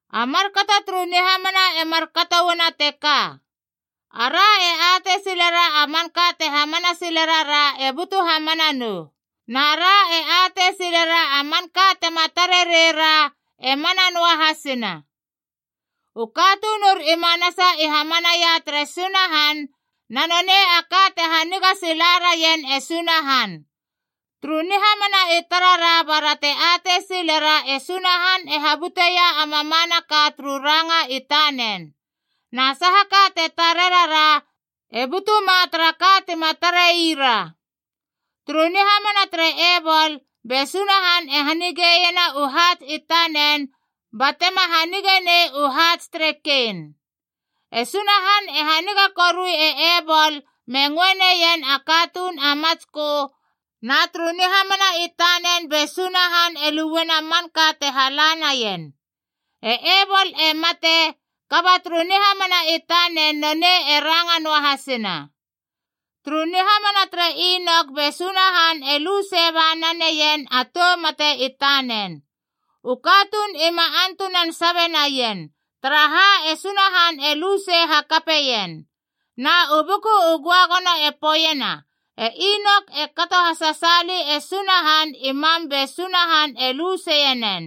A markato turu nihamana e markato uana teka: ara e atei silera a manka te hamana sile rara e butu hamana nou. Na ra e atei silera a manka tema tare rei ra e mana noahasina. U katunur i manasa i hamanaia tere Sunahan, na nonei a ka te haniga sila raien e Sunahan. Turu nihamana i tarara bara te atei silera e Sunahan e habuteia a mamanaka turu ranga i tanen. Na sahaka te tare rara, e butuma tara ka tima tarei ra. Turu nihamana tere Ebol, be Sunahan e hanigeiena u haats i tanen batema hanigenei u haats tere Kein. E Sunahan e haniga korui e Ebol me ngöe neien a katuun a matskö, na turu nihamana i tanen be Sunahan e luena manka te hala naien. E Ebol e mate, kaba turu nihamana i tanen nonei e ranga noahasina. Turu nihamana tere Inok be Sunahan e lu sei ba naneien a tou mate i tanen. U katuun ima antunan sabe naien, taraha e Sunahan e lu sei hakapeien. Na u Buku u Göagono e poeiena e Inok e kato hasasaali e Sunahan i mam be Sunahan e lu seienen.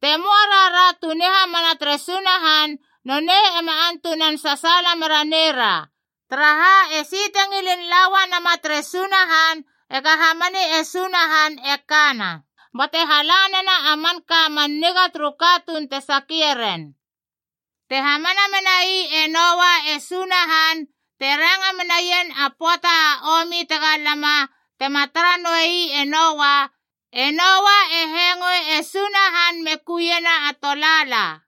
Te möa rara tu nihamana tere Sunahan, nonei ema antunan sasaala mera neira. Taraha, esi te ngilin la uanama tere Sunahan ega hamani e Sunahan e kana, bate hala nena a manka man niga turu katuun te sakie ren. Te hamana menai e Noa e Sunahan te ranga menaien a pöata a omi tega lama tema tara noei e Noa, e Noa e hengöe e Sunahan me kuiena a tolaala,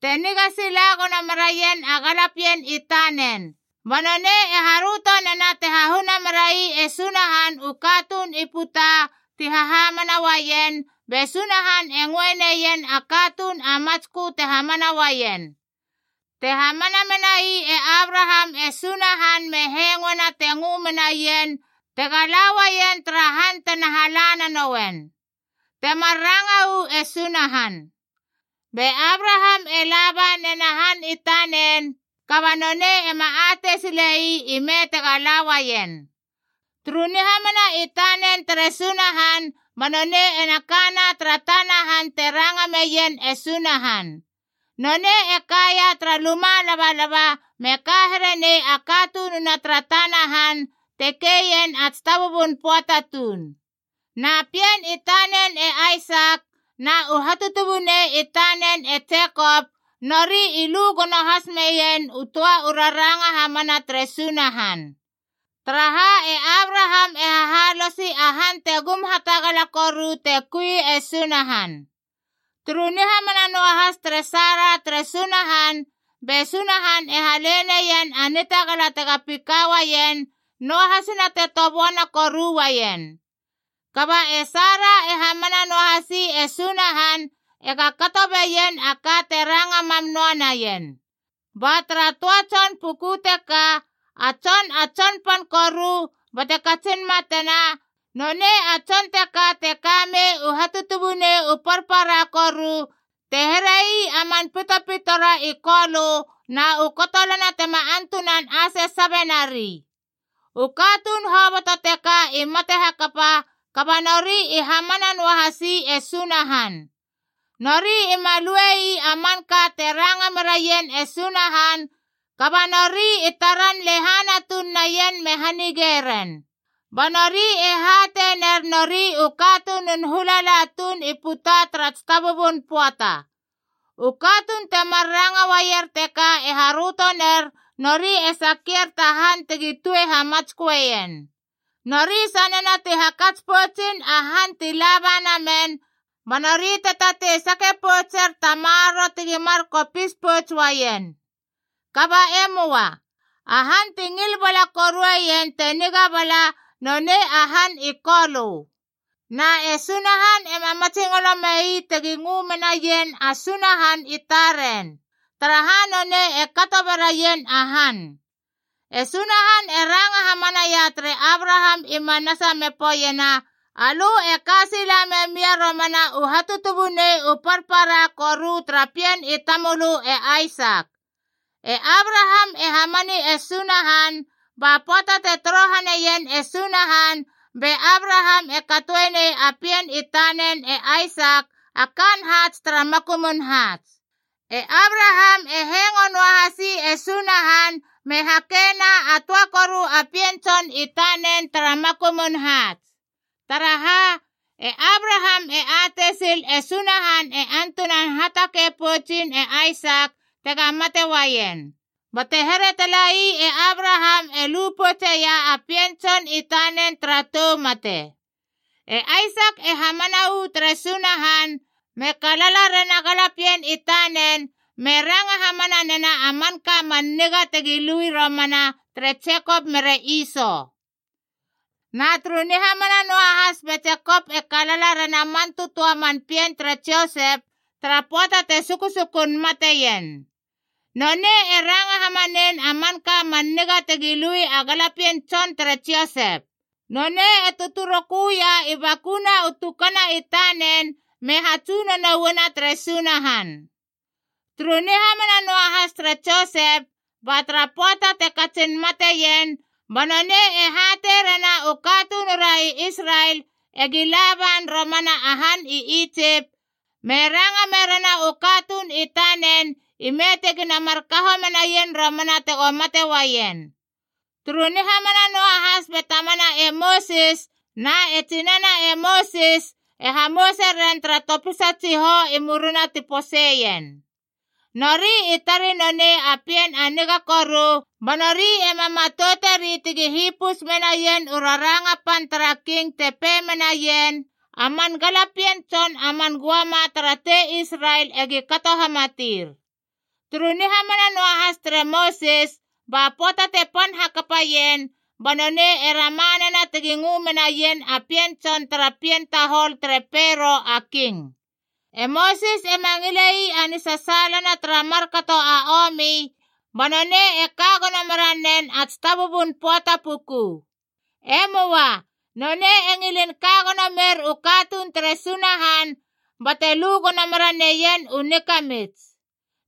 te niga sila gono meraien a galapien i tanen. Ba nonei e haröto nena te hahuna merai e Sunahan u katuun i puta ti hahamana uaien, be Sunahan e ngöe neien a katuun a matskö te hamana uaien. Te hamana menai e Abraham e Sunahan me hengoena te ngö menaien tega la uaien tara han tena hala nanouen, temar ranga uu e Sunahan. Be Abraham e laba nena han i tanen, kaba nonei ema atei sile ii ime tega la uaien. Turu nihamana i tanen tere Sunahan ba nonei ena kana tara tana han te ranga meien e Sunahan. Nonei e kaia tara luma labalaba me ka here nei a katununa tara tana han te keien a tsitabubun pöata tuun. Na pien i tanen e Aisak na u hatutubunei i tanen e Jekop, nori i lu gono has meien u töa u raranga hamana tere Sunahan. Taraha, e Abraham e hahalosi a han te gum hatagala koru te kui e Sunahan. Turu nihamana noahas tere Sara tere Sunahan, be Sunahan e hale neien a nitagala tega pika uaien, noahasina te toböana koru uaien. Kaba e Sara e hamana noahasi e Sunahan ega kato beien a ka te ranga mam noa naien. Ba tara töa tson puku teka, a tson a tsonpan koru bate katsin matena, nonei a tson teka te kamei u hatutubunei u parpara koru te herei a man pitopitora i kolö na u kotolana tema antunan ase sabe nari. U katuun hoboto teka i mate hakapa, kaba nori i hamana noahasi e Sunahan. Nori ima lue ii a manka te ranga meraien e Sunahan, kaba nori i taran lehana tuun naien me hanige ren. Ba nori e hatei ner nori u katunun hulala tuun i puta tara tsitabubun pöata. U katuun temar ranga uaier teka e haröto ner nori e sakier ta han tegi tue hamatsköeien. Nori sanena ti hakats poutsin a han ti laba namen, ba nori te tatei sake poutser ta maroro tegi mar kopis pouts uaien. Kaba e möa. A han ti ngil bala korueien te niga bala, nonei a han i Kolö. Na e Sunahan ema matsingolo mei tegi ngö menaien a Sunahan i taren, taraha nonei e kato beraien a han. E Sunahan e ranga hamanaia tere Abraham i manasa me poeiena, “Alö e ka sila memia romana u hatutubunei u parpara koru tara pien i tamölö e Aisak.” E Abraham e hamani e Sunahan, ba pöata te torohane ien e Sunahan be Abraham e katoenei a pien i tanen e Aisak a kaan haats tara makumun haats. E Abraham e hengo noahasi e Sunahan me hakena a töa koru a pien tson i tanen tara makumun haats. Taraha, e Abraham e atei sil e Sunahan e antunan hatakei poutsin e Aisak tega mate uaien. Bate here talei e Abraham e lu poutseia a pien tson i tanen tara tou mate. E Aisak e hamana uu tere Sunahan, me kalala rena galapien i tanen me ranga hamana nena a manka man niga tegi lui romana ere Jekop mere Iso. Na turu nihamana noahas be Jekop e kalala rena man tötöa man pien tere Josep tara pöata te susukun mateien. Nonei e ranga hamanein a manka man niga tegi lui a galapien tson tere Josep. Nonei e tötöroköia i bakuna u tukana i tanen me hatsunono uana tere Sunahan. Turu nihamana noahas tere Josep, ba tara pöata te katsin mateien, ba nonei e hatei rena u katunura i Israel egi laban romana a han i Itsip, me ranga merena u katuun i tanen ime tegina mar kaho menaien romana tego mate uaien. Turu nihamana noahas be tamana e Mosis na e tsinana e Mosis e hamouse ren tara topisa tsihou i murina ti poseien. Nori i tarei nonei a pien a niga koru, ba nori ema matouteri tegi hipus menaien u raranga pan tara king te pei menaien, “A man galapien tson a man göama tara tei Israel egi kato hamatir.” Turu nihamana noahas tere Mosis, ba pöata te pan hakapaien, ba nonei e rama nena tegi ngö menaien a pien tson tara pien tahol tere Pero a King. E Mosis ema ngile ii a nisasaalana tara markato a omi ba nonei e ka gono meranen a tsitabubun pöata puku. E möa. Nonei e ngilin ka gono mer u katuun tere Sunahan, bate lu gono meraneien u nikamits.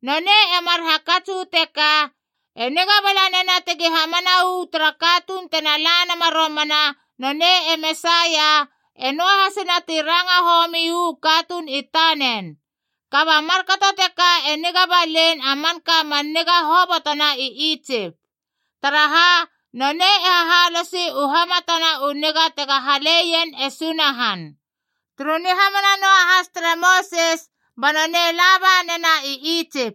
Nonei e mar hakats uu teka, e niga bala nena tegi hamana uu tara katuun tena la nama romana nonei e Mesaia, e noahasina ti ranga homi uu katuun i tanen. Kaba markato teka e niga balein a manka man niga hobotona i Itsip. Taraha, nonei e hahalosi u hamatana u niga tega haleien e Sunahan. Turu nihamana noahas tere Mosis ba nonei laba nena i Itsip.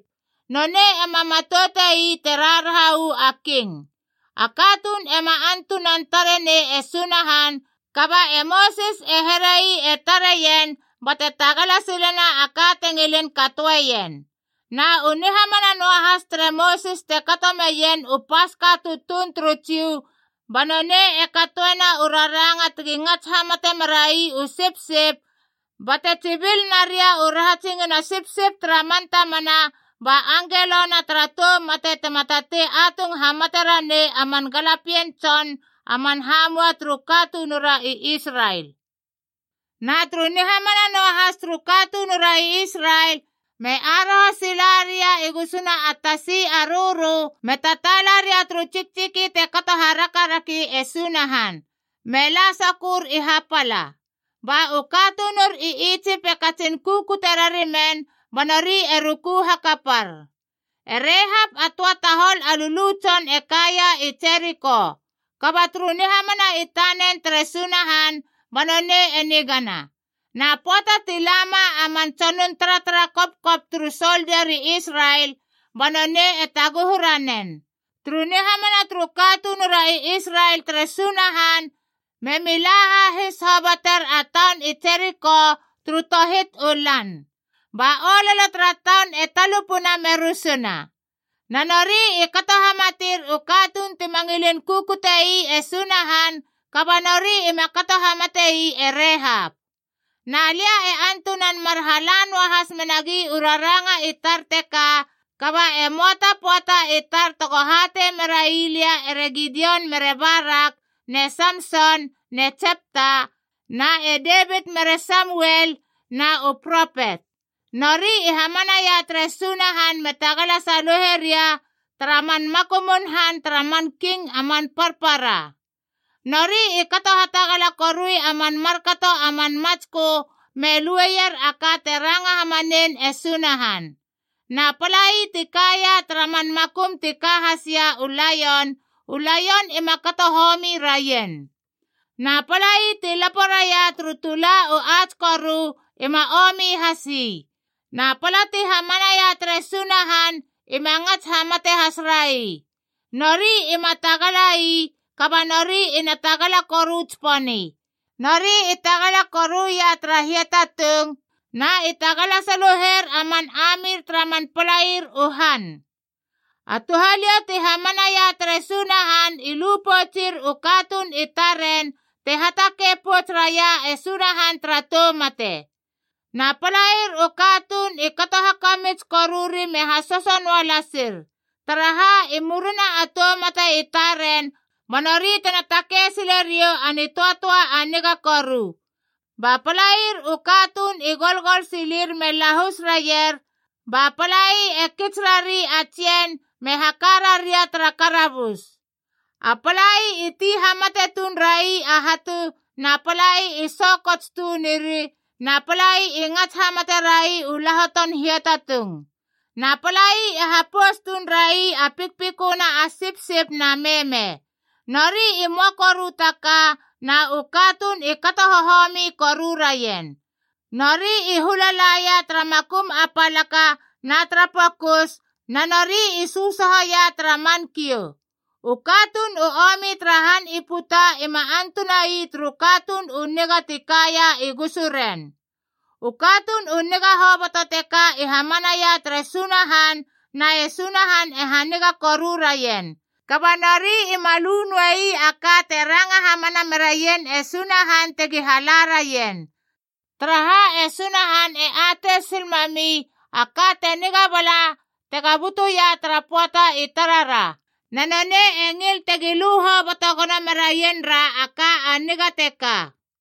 Nonei ema matoute ii te raharaha uu a king. A katuun ema antunan tare nei e Sunahan, kaba e Mosis e herei e tareien bate tagala silena a ka te ngilin katoeien. Na u nihamana noahas tere Mosis te kato meien u Paska tutuun turu Jiu ba nonei e katoena u raranga tegi ngats hamate merai u sipsip bate tsibil naria u rahatsingina sipsip tara man tamana, ba Angelona tara Tou Mate tema tatei atung hamate ranei a man galapien tson a man hamua turu katunura i Israel. Na turu nihamana noahas turu katunura i Israel, me aroho sila ria i gusuna a Tasi a Rörö me tataala ria turu tsiktsiki te kato harakaraki e Sunahan, me la sokör i hapala. Ba u katunur i Itsip e katsin kukute rarimen ba nori e ruku hakapar. E Rehap a töa tahol a lulu tson e kaia i Jeriko. Kaba turu nihamana i tanen tere Sunahan ba nonei e nigana. Na pöata ti lama a man tsonun taratara kopkop turu soldia ri Israel, ba nonei e taguhu ranen. Turu nihamana turu katunura i Israel tere Sunahan memi la hahis hoboter a taun i Jeriko turu tohit u lan, ba ololo tara taun e talupuna me rusuna. Na nori i kato hamatir u katuun tima ngilin kukute ii e Sunahan, kaba nori ima kato hamate ii e Rehap. Na lia e antunan mar hala noahas menagi u raranga i tar teka, kaba e möa ta pöata i tar tego hatei merai lia ere Gidion mere Barak ne Samson ne Jepta, na e Devit mere Samuel na u propet. Nori i hamanaia tere Sunahan me tagala saluhe ria tara man makumun han tara man king a man parpara. Nori i kato hatagala korui a man markato a man matskö me lueier a ka te ranga hamanein e Sunahan. Na palai ti kaia tara man makum ti ka hasia u laion, u laion ima kato homi raien. Na palai ti lapo raia turu tula u ats koru ima omi has ii. Na pala ti hamanaia tere Sunahan ima ngats hamate has rai. Nori ima tagala ii, kaba nori ina tagala koru tsiponi. Nori i tagala koruia tara hiatatung, na i tagala saluher a man amir tara man palair u han. A touhaliou ti hamanaia tere Sunahan i lu poutsir u katuun i taren te hatakei pouts raia e Sunahan tara tou mate. Na palair u katuun i kato hakamits koruri me hasoso noa lasir, taraha i murina a tou mate i taren ba nori tena takei sile riou a nitöatöa a niga koru. Ba palair u katuun i golgol silir me lahus raier, ba palai e kits rari a tsien me haka raria tara karabus. A palai i ti hamate tuun rai a hatu, na palai i so kots tunir, na palai i ngats hamate rai u lahoton hiatatung. Na palai i hapous tuun rai a pikpiköna a sipsip na meme. Nori i möa koru ta ka, na u katuun i kato hohomi koru raien. Nori i hula laia tara makum a palaka na tara pokus, na nori i sösohoia tara man kiou. U katuun u omi tara han i puta ima antuna ii turu katuun u niga ti kaia i gusuren. U katuun u niga hoboto teka i hamanaia tere Sunahan na e Sunahan e haniga koru raien. Kaba nori ima lu noei a ka te ranga hamana meraien e Sunahan tegi hala raien. Taraha, e Sunahan e atei sil mami a ka te niga bala tega butuia tara pöata i tarara, na nonei e ngil tegi lu hoboto gono meraien ra a ka a niga teka.